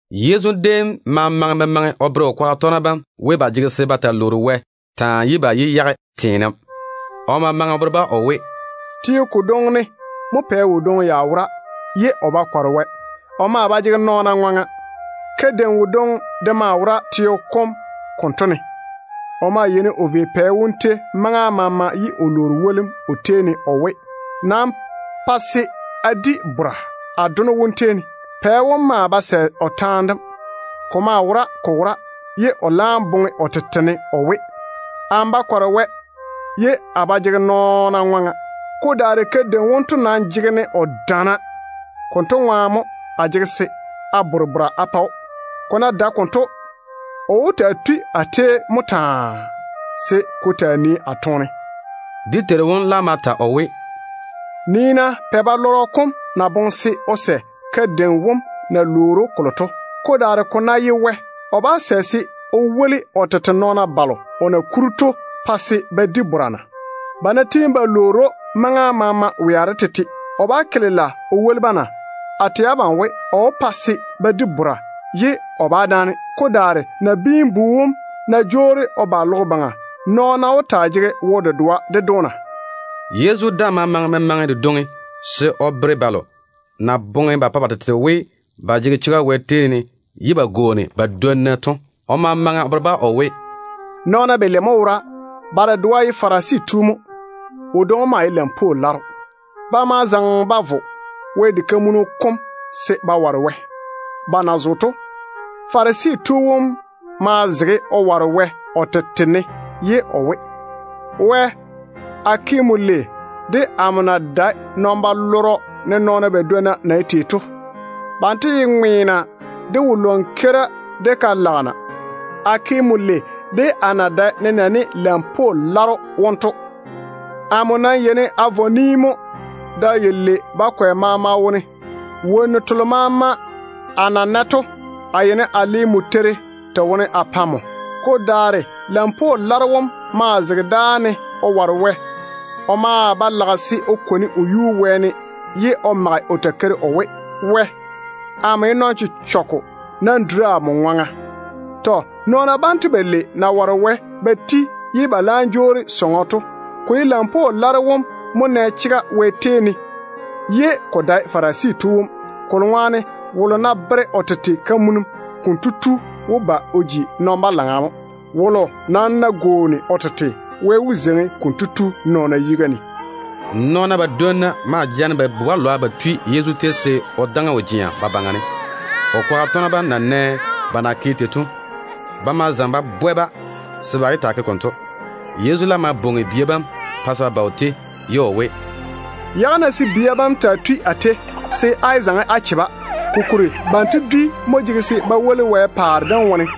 Yezu déem ma maŋe memaŋe o bere o kwaga tɔgena bam we, ba jege se ba taa lwoori Wɛ taa, se ba yé yage teenem. O ma maŋe o bere-ba o we: “Teo kodwoŋi ne mo pɛ wodwoŋi ya wora ye o ba kɔre Wɛ. O maa ba jege nɔɔna ŋwaŋa. Kadeim wodwoŋi de maa wora teo kom konto ne. O maa yeini o vei pɛ wom tei maŋa maama ye o lwoori wolim o tei ne o we, ‘Nam pa se a di bora a dono wom tei ne.’ Pɛ wom maa ba sɛ o taane dem. Ko maa wora ko wora ye o laam boŋe o tete ne o we, ‘Amo ba kɔre Wɛ, ye a ba jege nɔɔna ŋwaŋa. Ko daare kadeim wonto nam jege-ne o daana. Konto ŋwaane mo a jege se a bore bora a pa‑o. Ko ná dae konto, o wó taa tui a tei mo taa se ko taa nii a toone.’” Dé Teiru wom laam ma ta o we, “Nii-na pɛ-balɔrɔ kom na boŋe se o sɛ o ke kadeim wom na lwoori‑o kolo to. Ko daare ko ná ye Wɛ, o bá sɛ se o woli o tete nɔɔna balo o na kuri to pa se ba di bora na? Ba ná tiini ba lwoori‑o maŋa maama wea de tete, o bá ke lela o woli-ba na? A tɛ abam we, o wó pa se ba di bora ye o bá dáane. Ko daare Nabiin-bu wom ná jwoori o ba logo baŋa, nɔɔna ta wó taa jege wo-dedoa ded‑o na?” Yezu daa ma maŋe memaŋe dedwoŋi se o bere balo na boŋe ba pa ba tete we ba jege chega Wɛ tei ne ye ba gwooni ba dwonna to. O ma maŋe o bere-ba o we, “Nɔɔna balei mo wora. Ba dedoa ye Farisi tu mo. Wodwoŋi wom maa ye lampwoo laro. Ba ma zaŋe ba vo Wɛ diga kam se ba ware Wɛ. Ba na zo to, Farisi tu wom ma zege o ware Wɛ o tete ne ye o we, ‘Wɛ, a ke nmo lei de amo na dae nɔn-balɔrɔ ne nɔɔna badwonna na ye tei to. Banto ye ŋweena, de wo-lwan-keira, de ka-lagena. A ke nmo lei de a na dae nenɛɛne lampwoo laro wonto. Da yalei bakwɛ maama wone amo yeini a vɔ ni mo Wɛ ŋwaane. Wonnu telo maama a na nɛ to, a yeini a le Wɛ-teiri pɛɛra te wone a pa nmo.’ Ko daare lampwoo laro wom maa zege dáa ne o ware Wɛ. O maa ba lage se o kwoni o yuu wɛɛne, ye o mage o takeiri o we, ‘Wɛ, amo ye nɔn-chechɔgɔ. Nam duri amo ŋwaŋa.’ Tɔ. Nɔɔna banto balei na ware Wɛ ba ti ye ba laam jwoori sɔŋɔ to, ko ye lampwoo laro wom mo nɛ chega Wɛ tei ne, ye ko dae Farisi tu wom. Kolo ŋwaane wolo ná bere o tete kamunim, konto tu wó ba o ji nɔn-balaŋa mo. Wolo nam ná gwooni o tete, Wɛ wó zeiŋi konto tu nɔɔna yiga ne.” Nɔɔna badwonna maa jaane ba bu-balwa ba tui Yezu tei se o daŋe o jea ba baŋa ne. O kwaga tɔgena bam na nɛ ba na ke tei to, ba ma zaŋe ba bwɛ-ba se ba yé taa ke konto. Yezu laam ma bwoŋi bia bam pa se ba ba o tei, ye o we, “Yage-na se bia bam taa tui a tei, se á yé zaŋe á che-ba. Kokuri Wɛ paare dem ye banto dwi nyem mo.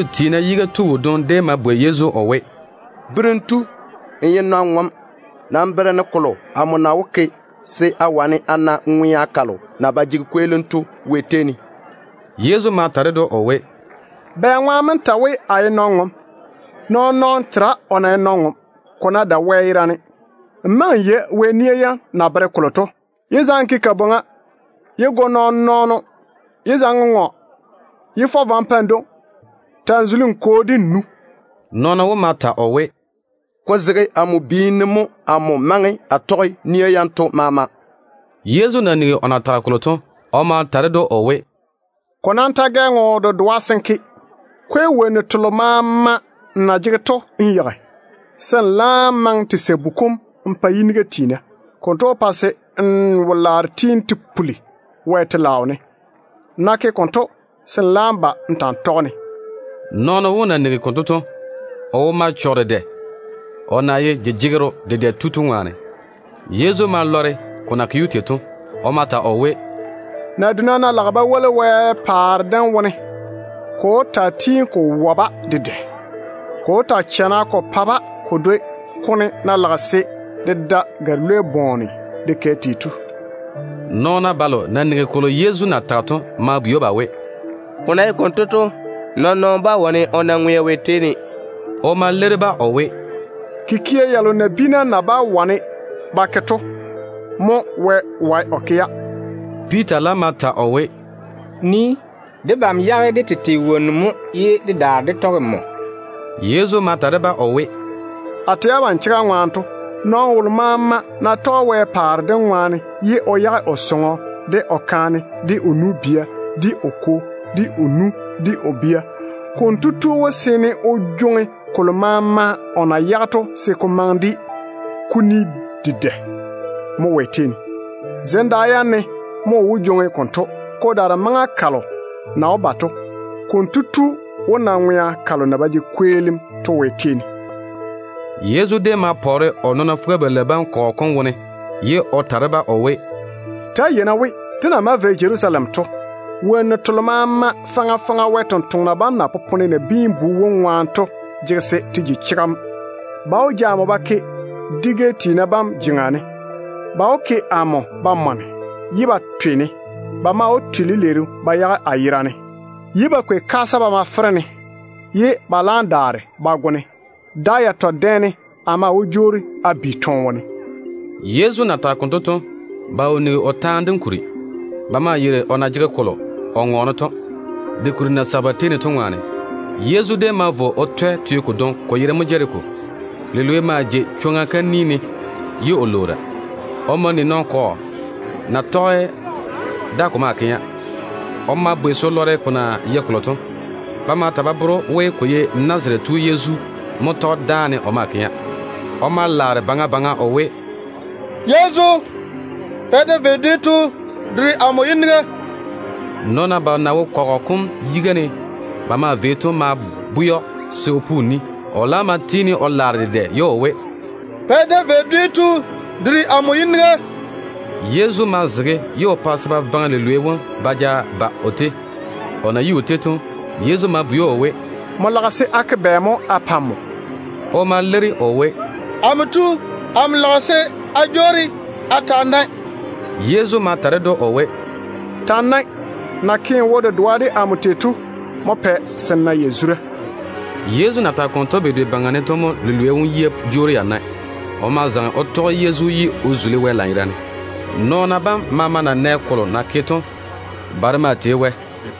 Juu tiina yiga tu wodwoŋi déem ma bwei Yezu o we, “Berem tu, n ye nɔn-ŋom. Nam bere-ne kolo amo na wó ke se a wane a na ŋwea kalo na ba jege kweelim Wɛ tei ne to.” Yezu ma ta ded‑o o we, “Bɛŋwaane mo n ta n we, a ye nɔn-ŋom? Nɔɔn-nɔɔno tera o na ye nɔn-ŋom, ko ná dae Wɛ yerane. Nmo maŋe n yei Wɛ nia yam na bere kolo to. Yé zaŋe n ke kabwoŋa. Yé go nɔɔn-nɔɔno. Yé zaŋe n ŋɔ. Yé fɔ vwa n pa n dwoŋi. Ta‑n zuli n kwo de n nu.” Nɔɔno wom ma ta o we, “Ko zege amo biini ne mo amo maŋe a tɔge nia yanto maama.” Yezu na nigi o na tage kolo to, o ma ta ded‑o o we, “Ko nam ta gɛ ŋo dedoa se n ke. Kwei wonnu telo maama n na jege to n yeigi, se n laam maŋe te sabu kom n pa yiniga tiina. Konto wó pa se n wo-laaro tiini te puli Wɛ telaao ne. Nmo ná ke konto, se n laam ba n ta n tɔge-ne.” Nɔɔno wom na nigi konto to, o wo ma chɔge dedɛ, o na ye jejegero dedɛ tu to ŋwaane. Yezu ma lɔre ko na ke‑o tei to. O ma ta o we, “Naduna ná lage ba zo Wɛ paare dem wone, ko wó taa tiini ko chana ko pa-ba. Ko wó taa chana ko pa-ba ko dwoi kone ná lage se de da gare-lwei bɔɔne de kɛ tei to.” Nɔɔna balo na nigi kolo Yezu na tage to ma bwei‑o ba we, “Ko nam ná ye konto, wɔ mo wó wane o na ŋwea Wɛ tei ne?” O ma leiri-ba o we, “Kikia yalo nabiina na bá wane ba ke to mo Wɛ wae o ke-ya.” Piita laam ma ta o we, “Nii mo. Debam yage dé tete wonnu mo ye dé daare dé tɔge nmo.” Yezu ma ta de-ba o we, “A tɛ abam chega ŋwaane to, nɔɔno wolo maama ná tɔge Wɛ paare dem ŋwaane ye o yage o sɔŋɔ, de o kaane, de o nu-bia, de o kwo, de o nu, de o bia, konto tu wó seene o jwoŋi kolo maama o na yage to se ko maŋe de kuni dedɛ dedɛ mo Wɛ tei ne. Zem da yam ne mo o wó jwoŋi konto. Ko daare maŋa kalo na wó ba to, konto tu wó na ŋwea kalo na ba jege kweelim Wɛ tei ne to.” Yezu déem ma pwɛ o nɔɔna fuga-balei bam kɔgɔ kom wone, ye o ta de-ba o we, “Ta‑á yei-na we, dé na maa vei Jerusalem to, wonnu telo maama faŋa faŋa Wɛ sampwori sem na popone Nabiin-bu wom ŋwaane to jege se te ji chega mo. Ba wó ja amo ba ke dwi-gɛ tiina bam jeŋa ne. Ba wó ke amo ba mɔne, ye ba twe-ne. Ba maa wó twe lileeru ba yage a yera ne, ye ba kwei kaasa ba ma fere-ne, ye ba laam daare ba go-ne. Da yatɔ dɛ ne a maa wó jwoori a bi toone wone.” Yezu na tage konto to, ba wo nigi o taane dem kuri. Ba maa yeiri o na jege kolo o ŋɔɔne to, de kuri na seigi ba tei ne to ŋwaane. Yezu déem ma vo o twɛ teo kodwoŋi, ko yere mo Jeriko. Lilwei maa jei chwoŋa kam ni ne ye o lwoora. O ma ni nɔn-kɔgɔ na tɔge da ko maa kɛa. O ma bwei se o lɔre kolo na ke to. Ba ma ta ba bere‑o we, ko ye Nazarete tu Yezu mo tɔge dáane o maa kɛa. O ma laare baŋa baŋa o we, “Yezu, Pɛ David dwi tu, duri amo yiniga!” Nɔɔna balo na wo kɔgɔ kom yiga ne ba maa vei to ma bwɛ‑o se o pu o ni. O laam ma tiini o laare dedɛ ye o we, “Pɛ David dwi tu, duri amo yiniga!” Yezu ma zege ye o pa se ba vaŋe lilwei wom ba ja ba o tei. O na yi o tei to, Yezu ma bwei‑o o we, “Nmo lage se a ke bɛ mo a pa nmo?” O ma leiri o we, “Amo tu, amo lage se a jwoori a taa nae mo.” Yezu ma ta ded‑o o we, “Ta‑n nae. Nmo na ke n wo-dedoa de amo tei to mo pɛ se n na yazura.” Yezu na tage konto bedwe baŋa ne to mo lilwei wom yia jwoori ya nae. O ma zaŋe o tɔge Yezu ye o tei Wɛ lanyerane. Nɔɔna bam maama na nɛ kolo na ke to, ba de maa tei Wɛ.